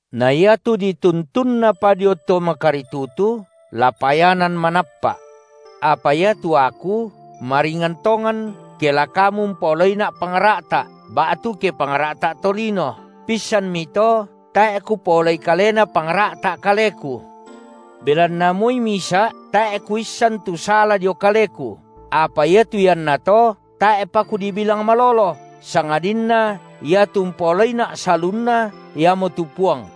Na iatu dituntunnapa dio to makaritutu, la payanan manappa’. Apa iatu aku maringan tongan, ke la kamu umpaolaina’ pangra’ta’ ba’tu ke pangra’ta’ tolino, pissanmi to tae’ kupaolai kalena pangra’ta’ kaleku. Belanna moi misa’ tae’ kuissan tu sala dio kaleku; apa iatu iannato tae’pa kudibilang malolo, sangadinna iatu umpaolaina’ salunna Iamotu Puang.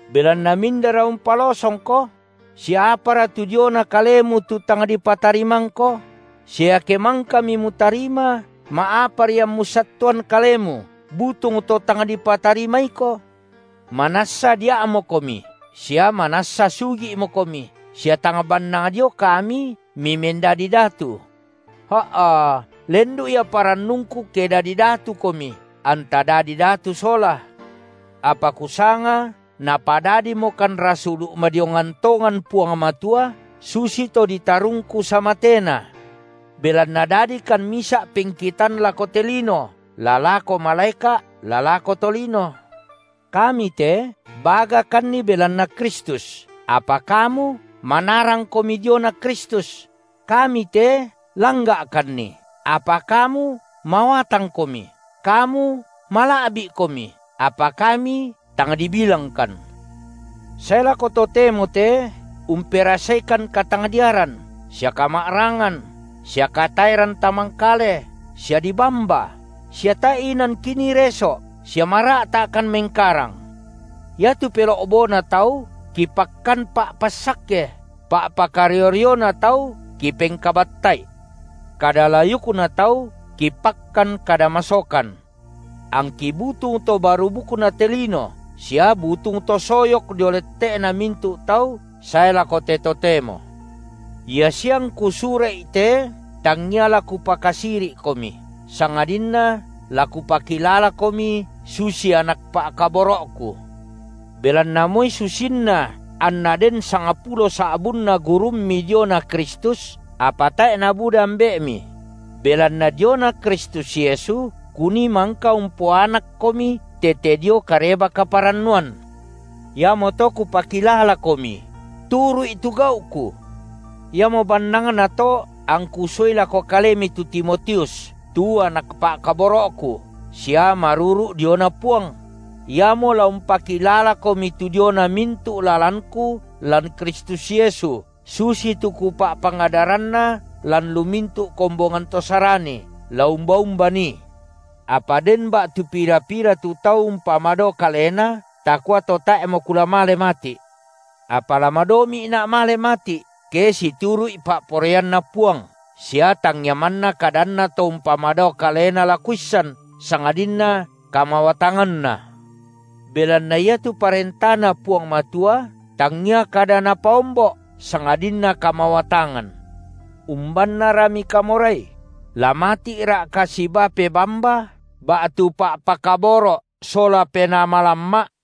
Belanna mindara umpalosongko? Sia apara tu diona kalemu tu tang di patarimangko? Sia iake mangkami mutarima, ma’apari ammu sattuan kalemu, butung to tang dipatarimaiko? Manassa dia’mokomi sia manassa sugi’mokomi sia tang bannang dio kami mimendadi datu. Ha’a, lendu’ ia parannungku ke dadi datukomi, anta dadi datu sola! Apa kusanga Napadadimokan rasulu’ madiongan tongan Puang Matua susito ditarungku samatena. Belanna dadikan misa’ pengkitan lako te lino, la lako malaeka’, la lako tolino. Kami te bagakanni belanna Kristus; apa kamu manarangkomi diona Kristus; kami te langga’kanni, apa kamu mawatangkomi, kamu mala’bi’komi, apa kami tang dibilangkan. Sae lako totemo te umperasaikan katangdiaran sia kama’rangan sia kataeran tamangkale sia dibamba sia tae’ inan kinii reso’, sia mara’ta’kan mengkarang. Iatu pelo’bona tau kipakkan pa’passakke, pa’pakario-riona tau kipengkabatta’i. Kada layukna tau kipakkan kada masokan. Angki butung to barubukna te lino sia butung to soyok dio lette’na mintu’ tau sae lako te totemo. Ia sia angku sura’i te tangia la kupakasiri’komi, sangadinna la kupakilalakomi susi anak pa’kaboro’ku. Belanna moi susinna anna den sangpulo sa’bunna gurummi diona Kristus, apa tae’ nabuda ambe’mi; belanna diona Kristus Yesu kunii mangka umpoanakkomi tete dio Kareba- kaparannuan. Iamoto kupakilalakomi: turu’i tu gau’ku. Iamo bannangna to angku suai lako kalemi tu Timotius, tu anak pa’kaboro’ku sia maruru’ diona Puang; iamo la umpakilalakomi tu diona mintu’ lalanku lan Kristus (Yesu) susitu kupa’pangadaranna lan lu mintu’ kombongan to Sarani la umba-umba nii. Apa den ba’tu pira-pira tu tau umpamadao kalena takua to tae’mo kula male mati’. Apa la madomi’na’ male mati’, ke situru’i pa’poraianNa Puang sia tangia manna kadanna to umpamadao kalena la kuissan, sangadinna kamawatanganna. Belanna iatu ParentaNa Puang Matua tangia kada napaombo’, sangadinna kamawatangan. Umbannara mikamorai? La mati’ra’ka sibaa pebamba, ba’tu pa’pakaboro’ sola penaa malamma’?